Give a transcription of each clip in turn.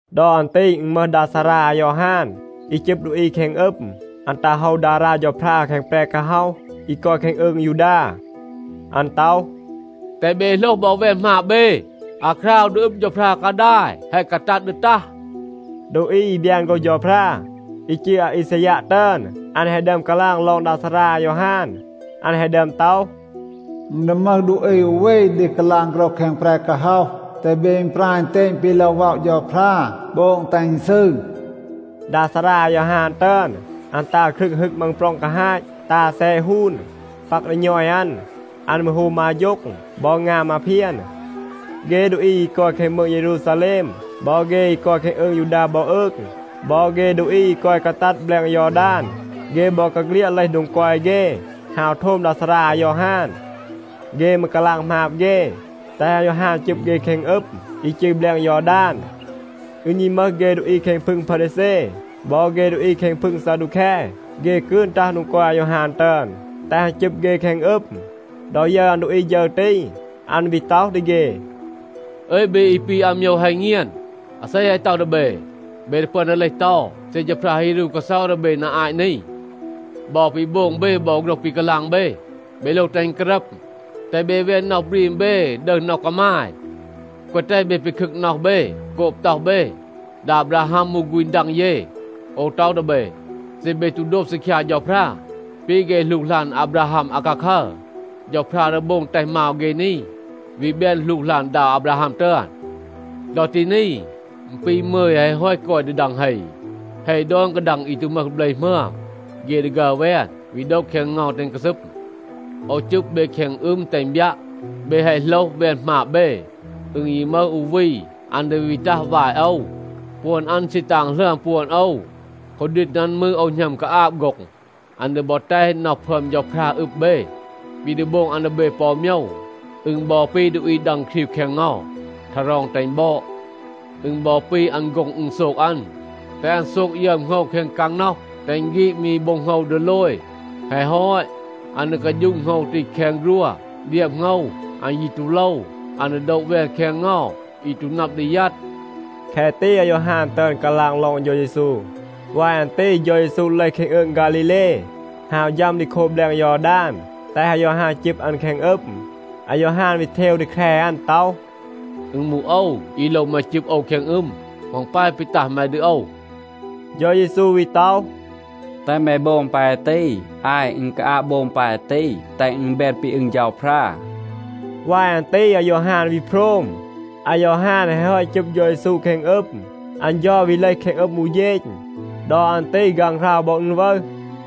ดอ อัน ตี อึณ มึห ดา ซารา อายอฮาน, อี จึบ ดูอี แคง อึม. อัน ตัห โฮว ดารา เฌาพรา แคง แปร กาฮ็อห อี กอย แคง อืง ยูดา. อัน ต็อห, “แตห เบ โหลห บอ แวน หมาบ เบ. อาคราว ดี อึบ เฌาพรา กาดาย แฮะ กาตัด ดี ตัห.” ดูอี อี บยาน โฆรห เฌาพรา, อี จืร อาอีซายัะ ตึอน, อัน แฮะ ดึอม กาลาง ลอง ดา ซารา อายอฮาน. อัน แฮะ ดึอม ต็อห, “อึณ ดี มึห ดูอี อู วี ดี กาลาง โฆรห แคง แปร กาฮ็อห, ‘แตห เบ อึณปราย อึณเตณ ปี โลว ว็อะ เฌาพรา. โบง, แตห อึณ ซืร.’” ดา ซารา อายอฮาน ตึอน, อัน ตา ครึง ฮึก มังปร็อง กาฮาต, ตา แซะ ฮูน, ปัก ดี ณอย อัน. อัน มืร โฮม มา อาโฌ็ง บอ งาม มาเพียน.a เฆ ดูอี อี กอย แคง มืง เยรูซาแลม, บอ เฆ อี กอย แคง อืง ยูดา บอ อืง, บอ เฆ ดูอี อี กอย กาตัด แบลง ยอดาน, เฆ บอกาเฆลียด เลห โดง กอย เฆ, ฮาว โทม ดา ซารา อายอฮาน. เฆ มืร กาลาง หมาบ เฆ, แตห อายอฮาน จึบ เฆ แคง อึม อี จืร แบลง ยอดาน. อึณ ยี มึห เฆ ดูอี แคง พึง พารีแซ บอ เฆ ดูอี แคง พึง ซาดูแค, เฆ กืน ตัห โดง กอย อายอฮาน ตึอน, แตห อัน จึบ เฆ แคง อึม. ดอ ยึร อัน ดูอี ฌึร ตี, อัน วี ต็อห ดี เฆ, “อึย, เบ อี ปี อาโมยว ฮัณ เงียน. อาเซ แฮะ ต็อห ดี เบ, เบ ดี ปึอน ดี เลห เตา เซ เฌาพรา ฮี รู กาเซา ดี เบ นา อาต นี? บอ ปี โบง เบ บอ โฆรห ปี กาลาง เบ, เบ โลว แตห อึณ การัม. แตห เบ แวน น็อห บรีม เบ, ดึห น็อห กามาย. แกวะ แตห เบ ปีคึก น็อห เบ โกบ ต็อห เบ, ‘ดา อาบราฮัม มูห ฆูณ ดัง เย.’ โอว ต็อห ดี เบ, เซ เบ ตู โดบ ซีคยา เฌาพรา ปี เฆ หลูกหลาน อาบราฮัม อาคาคัร, เฌาพรา ดี โบง แตห มาว เฆ นี วี แบน หลูกหลาน ดา อาบราฮัม ตึอน. ดอ ตี นี, อึณ ปี มึย แฮะ ฮอต กอย ดี ดัง เฮ. เฮ ดอน กาดัง อี ตู มึห เบล หมึอม, เฆ ดี ฆัร แวน, วี โดะ แคง เงา, แตห อึณ กาซึม. โอว จึบ เบ แคง อึม, แตห อึณ บยัะ, เบ แฮะ โหลห หมาบ เบ, แวน หมาบ เบ. อึณ ยี มึห อู วี, อัน ดี วี ตัห วาย โอว. ปวน อัน ซี ตาง หลึอม ปวน โอว. คูดีณ อัน มืร, โอว หณัม กาอาบ โฆ็ง. อัน ดี บอ แตห น็อห พึอม เฌาพรา อึบ เบ. ปี ดี โบง อัน ดี เบ ปอ อู โมยว, อึณ บอ ปี ดูอี ดัง ครีว แคง เงา, ทารอง แตห อึณ บอด. อึณ บอ ปี, อัน โฆ็ง อึณโซก อัน, แตห อัน โซก ยึอม โหงว แคง กางน็อห, แตห อึณ ฆีด มี โบ็ง โหงว ดีโลย. แฮะ ฮอต, อัน ดี กาฌูะ โหงว ตี แคง ฆรัว. เดียบ โหงว, อัน ยี ตู โลว. อัน ดี โดะ แวน แคง เงา อี ตู นับ ดี ยัด.” แคะ ตี อายอฮาน ตึอน กาลาง ลอง เฌา เยซู. วาย อัน ตี เฌา เยซู เลห แคง อืง ฆาลีเล, ฮาว ฌัม ดี โคบ แบลง ยอดาน, แตห อายอฮาน จึบ อัน แคง อึม. อายอฮาน วี เทว ดี แคร อัน ต็อห, “อึณ มูห โอว, อี โลว แม จึบ โอว แคง อึม. เหมา อึณ ปาย ปี ตัห แม ดี โอว?” เฌา เยซู วี ต็อห, “แตห แม โบง ปาย ตี. อาย, อึณ กาอาบ โบง ปาย ตี, แตห อึณ แบน ปี อึง เฌาพรา.” วาย อัน ตี อายอฮาน วี โพรม. อายอฮาน แฮะ ฮอต จึบ เฌา เยซู แคง อึม, อัน เฌา วี เลห แคง อึม อู เฌณ. ดอ อัน ตี ฆางหราว บอ อึณ วึห.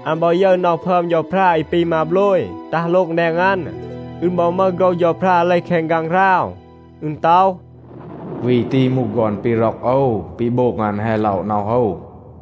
อัน บอ ยึร น็อห พึอม เฌาพรา อี ปี มาโบลย, ตัห โลง แดง อัน. อึณ บอ มึห โฆรห เฌาพรา เลห แคง ฆางหราว. อึณ ต็อห, “วี ตี มูห ฆอน ปี ร็อก โอว. ปี โบง อัน แฮะ ล็อะ น็อห โอว.”